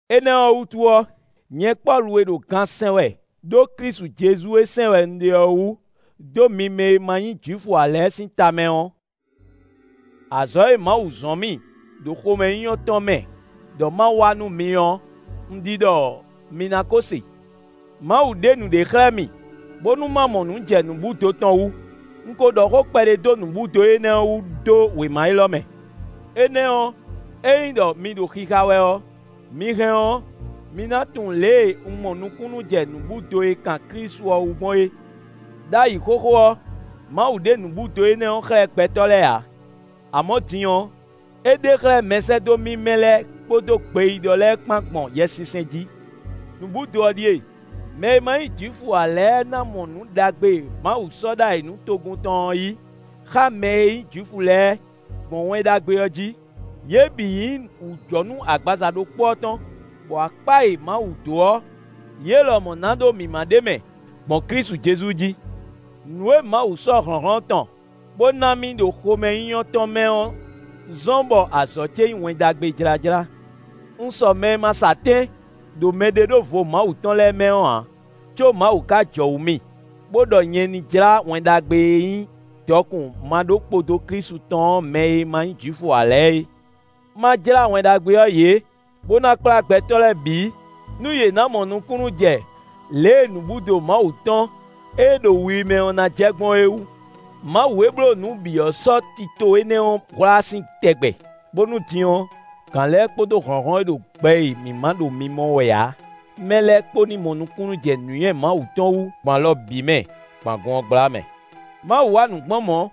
Énɛ́ ɔ́ wútu ɔ́, nyɛ Pɔ́lu e ɖo gan sɛn wɛ ɖó Klísu Jezu e sɛn wɛ un ɖe ɔ́ wú, dó mi mɛ e ma nyí Jwifu ǎ lɛ́ɛ sín tamɛ ɔ́, azɔ̌ e Mawu zɔ́n mì ɖo xomɛnyínyɔ́ tɔn mɛ ɖɔ ma wa nú mi ɔ́, un ɖi ɖɔ mi ná kó se. Mawu ɖe nǔɖé xlɛ́ mì, bónú ma mɔ nǔ jɛ nǔbúdo tɔn wú. Un ko ɖɔ xó kpɛɖé dó nǔbúdo énɛ́ ɔ́ wú dó wěma élɔ́ mɛ. Énɛ́ ɔ́, ényí ɖɔ mi ɖo xixa wɛ ɔ́, mi hɛn ɔ́, mi ná tunwun lě e un mɔ nukúnnú jɛ nǔbúdo e kan Klísu ɔ́ wú gbɔn é. Đ'ayǐ xóxó ɔ́, Mawu ɖe nǔbúdo énɛ́ ɔ́ xlɛ́ gbɛtɔ́ lɛ́ɛ ǎ; amɔ̌ din ɔ́, é ɖe xlɛ́ mɛsɛ́dó mímɛ́ lɛ́ɛ kpódó gbeyíɖɔ lɛ́ɛ kpán gbɔn Yɛsinsɛn jí. Nǔbúdo ɔ́ ɖíe: mɛ e ma nyí Jwifu ǎ lɛ́ɛ ná mɔ nǔ ɖagbe e Mawu sɔ́ ɖó ayǐ nú togun tɔn ɔ́ yí xá mɛ e nyí Jwifu lɛ́ɛ, gbɔn Wɛn Ɖagbe ɔ́ jí. Yě bǐ nyí wǔjɔnú agbaza ɖokpó ɔ́ tɔn, bɔ akpá e Mawu dó ɔ́, yě lɔmɔ̌ ná ɖó mǐmá ɖ'é mɛ gbɔn Klísu Jezu jí. Nǔ e Mawu sɔ́ hlɔ̌nhlɔ́n tɔn, bó ná mì ɖo xomɛnyínyɔ́ tɔn mɛ ɔ́ zɔ́n bɔ azɔ̌ ce nyí Wɛn Ɖagbe jlájlá. Un sɔ mɛ e ma sɔ atɛ́n ɖo mɛɖeɖóvo Mawu tɔn lɛ́ɛ mɛ ɔ́ ǎ, có Mawu ka jɔwǔ mì, bó ɖɔ nyɛ ní jlá Wɛn Ɖagbe e nyí dɔkun maɖókpodó Klísu tɔn ɔ́ mɛ e ma nyí Jwifu ǎ lɛ́ɛ é. Má jlá Wɛn Ɖagbe ɔ́ yě, bó ná kplá gbɛtɔ́ lɛ́ɛ bǐ, nú yě ná mɔ nukúnnú jɛ lě e nǔbúdo Mawu tɔn e ɖo wi mɛ ɔ́ ná jɛ gbɔn é wú. Mawu e bló nǔ bǐ ɔ́ sɔ́ tito énɛ́ ɔ́ hwlá sín tɛgbɛ, bónú din ɔ́, gǎn lɛ́ɛ kpódó hlɔ̌nhlɔ́n e ɖo gbɛ e mǐ ma ɖo mimɔ wɛ ǎ mɛ lɛ́ɛ kpó ní mɔ nukúnnú jɛ nǔnywɛ́ Mawu tɔn wú gbɔn alɔ bǐ mɛ gbɔn agun ɔ́ gbla mɛ. Mawu wa nǔ gbɔn mɔ̌,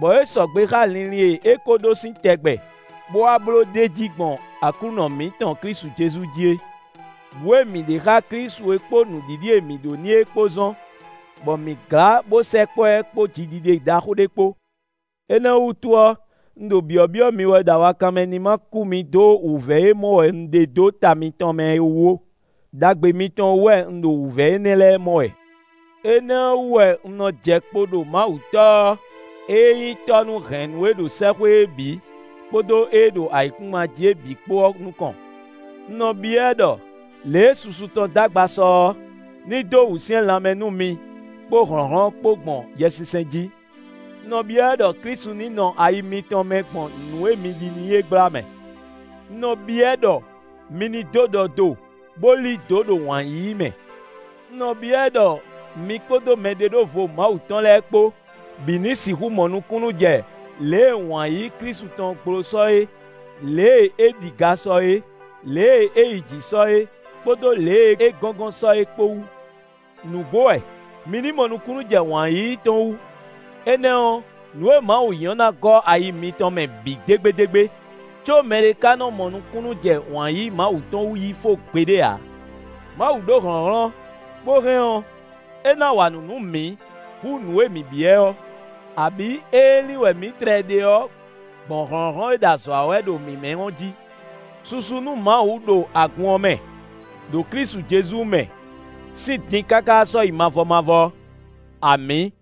bɔ é sɔgbe xá linlin e é ko ɖó sín tɛgbɛ, bó wá bló ɖ'é jí gbɔn Aklúnɔ mǐtɔn Klísu Jezu jí é. Bǔ e mǐ ɖe xá Klísu é kpó nǔɖiɖi e mǐ ɖó n'i é kpó zɔ́n bɔ mǐ glá bó sɛkpɔ́ ɛ kpó jiɖiɖe ɖaxó ɖé kpó. Énɛ́ ɔ́ wútu ɔ́, un ɖo byɔ̌byɔ́ mi wɛ ɖɔ awakanmɛ ní ma kú mi dó wǔvɛ́ e mɔ wɛ un ɖe dó ta mitɔn mɛ é wú ó; ɖagbe mitɔn wú wɛ un ɖo wǔvɛ́ énɛ́ lɛ́ɛ mɔ wɛ. Énɛ́ ɔ́ wú wɛ un nɔ jɛ kpo ɖo Mawu Tɔ́ ɔ́, ée nyí Tɔ́ nú hɛ̌nnu e ɖo sɛ́xwé é bǐ, kpódó ée ɖo ayǐkúngban jí é bǐ kpó ɔ́ nukɔn. Un nɔ byɔ́ ɛ ɖɔ, lě e susu tɔn d'agba sɔ ɔ́, ní dó wǔsyɛ́n lanmɛ nú mi kpó hlɔ̌nhlɔ́n kpó gbɔn Yɛsinsɛn jí. Un nɔ byɔ́ ɛ ɖɔ Klísu ní nɔ ayi mitɔn mɛ gbɔn nǔ e mi ɖi n'i é gbla mɛ. Un nɔ byɔ́ ɛ ɖɔ mi ní dó ɖɔ do, bó lí dǒ ɖo wǎn yíyí mɛ. Un nɔ byɔ́ ɛ ɖɔ mi kpódó mɛɖeɖóvo Mawu tɔn lɛ́ɛ kpó bǐ ní sixú mɔ nukúnnú jɛ lě e wǎn yíyí Klísu tɔn gbló sɔ é, lě e é ɖi ga sɔ é, lě e é yi jǐ sɔ é, kpódó lě e é gɔ́ngɔ́n sɔ é kpó wú. Nǔgbó wɛ! Mi ní mɔ nukúnnú jɛ wǎn yíyí tɔn wú, énɛ́ ɔ́, nǔ e Mawu nyí ɔ́ ná gɔ́ ayi mitɔn mɛ bǐ dégbédégbé. Có mɛɖé ka nɔ mɔ nukúnnú jɛ wǎn yíyí Mawu tɔn wú yí fó gbeɖé ǎ. Mawu ɖó hlɔ̌nhlɔ́n, bó hɛn ɔ́, é ná wa nǔ nú mǐ hú nǔ e mǐ byɔ́ ɛ ɔ́, abǐ ée lin wɛ mǐ tlɛ ɖe ɔ́ gbɔn hlɔ̌nhlɔ́n e ɖo azɔ̌ wa wɛ ɖo mǐ mɛ ɔ́ jí. Susu nú Mawu ɖo agun ɔ́ mɛ, ɖo Klísu Jezu mɛ, sín din káká sɔ́yi mavɔ mavɔ! Amǐ!